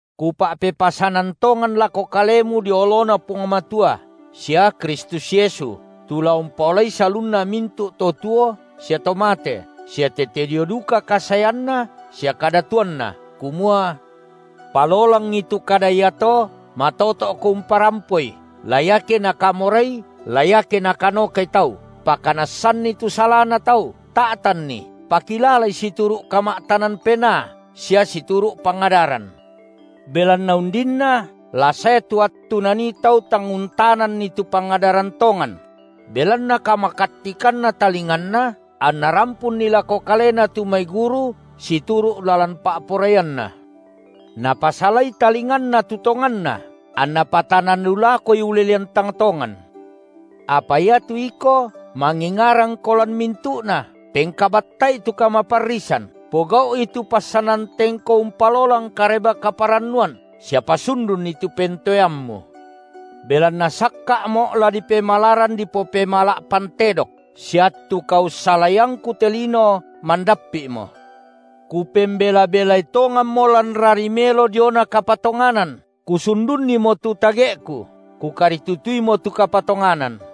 Kupa’pepasanan tongan lako kalemu dio oloNa Puang Matua sia Kristus Yesu, tu la umpaolai salunna mintu’ to tuo sia to mate, sia tete dio duka kasaeanNa sia kadatuanNa, kumua. Palolangi tu kada iato, matoto’ko umparampoi, la iake nakamorai la iake nakanokai tau, pakanassanni tu salana tau, ta’tanni, pakilalai situru’ kama’tanan penaa sia situru’ pangadaran. Belanna undinna la sae tu attu nanii tau tang untananni tu pangadaran tongan; belanna kamakattikanna talinganna anna rampunni lako kalena tu mai guru situru’ lalan pa’poraianna, napasalai talinganna tu tonganna, anna patanan lu lakoi ulelean tang tongan. Apa iatu iko mangingarangko lan mintu’na, pengkabatta’i tu kamaparrisan, pogau’i tu passanan tengko umpalolang Kareba-kaparannuan sia pasundunni tu pentoeammu. Belanna sakka’mo’ la dipemalaran dipopemala’ pantedok, sia attu kaussalaiangku te lino mandappi’mo. Kupembela-belai tonganmo lan rari melo diona kapatonganan, kusundunnimo tu tage’ku, kukaritutuimo tu kapatonganan.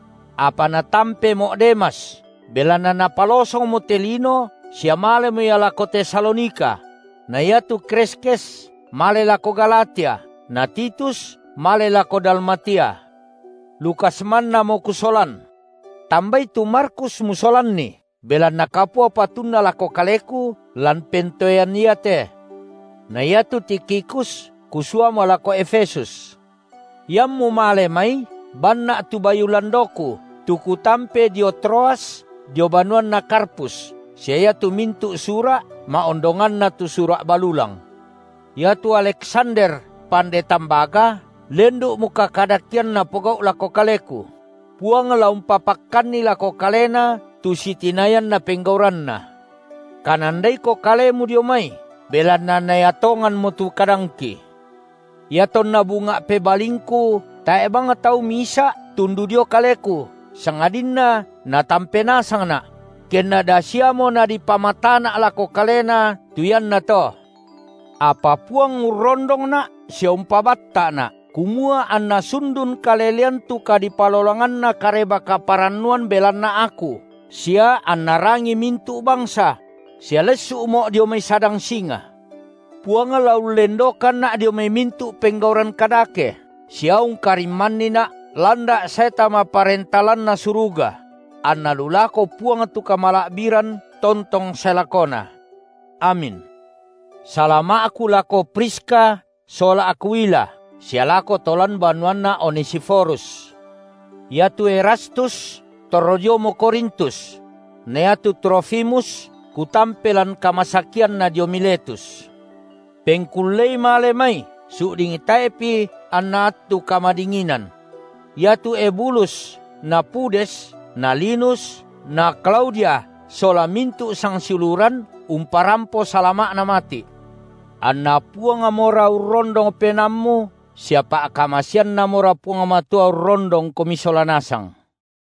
Apa natampemo’ Demas, belanna napalosongmo te lino sia malemo ia lako Tesalonika; na iatu Kreskes male lako Galatia, na Titus male lako Dalmatia; Lukas mannamo kusolan. Tambai tu Markus musolanni, belanna kapua patunna lako kaleku lan pentoean iate. Na iatu Tikhikus kusuamo lako Efesus. Iammu male mai, banna’ tu bayu landoku, tu kutampe dio Troas dio banuanna Karpus, sia iatu mintu’ sura’, ma’ondonganna tu sura’ balulang. Iatu Aleksander, pande tambaga, lendu’mo kakadakean napogau’ lako kaleku; Puang la umpapakkanni lako kalena tu sitinayanna penggauranna. Kanandaiko kalemu dio mai, belanna naea tonganmo tu kadangki. Iatonna bunga’ pebalingku tae’ bang tau misa’ tundu dio kaleku, sangadinna natampe nasangna’; kenna da siamo nadipamatana’ lako kalena tu iannato. Apa Puang urrondongna’ sia umpabatta’na’, kumua anna sundun kalelean tu kadipalolanganna Kareba-kaparannuan belanna aku sia anna rangii mintu’ bangsa; sia lessu’mo’ dio mai sadang singa. Puang la ullendokanna’ dio mai mintu’ penggauran kadake sia ungkarimmannina’ landa’ sae tama Parenta lanNa suruga; anna lu lako Puang tu kamala’biran tontong sae lakona. Amin. Salama’na rasulu’ Salama’ku lako Priska sola Akwila, sia lako to lan banuanna Onesiforus. Iatu Erastus torro diomo Korintus; na iatu Trofimus kutampe lan kamasakianna dio Miletus. Pengkullei male mai su’ding tae’pi anna attu kamadinginan. Iatu Ebulus na Pudes na Linus na Klaudia sola mintu’ sangsiuluran umparampo salama’na mati’. AnNa Puangmora urrondong penaammu sia pa’kamaseanNamora Puang Matua urrondongkomi sola nasang.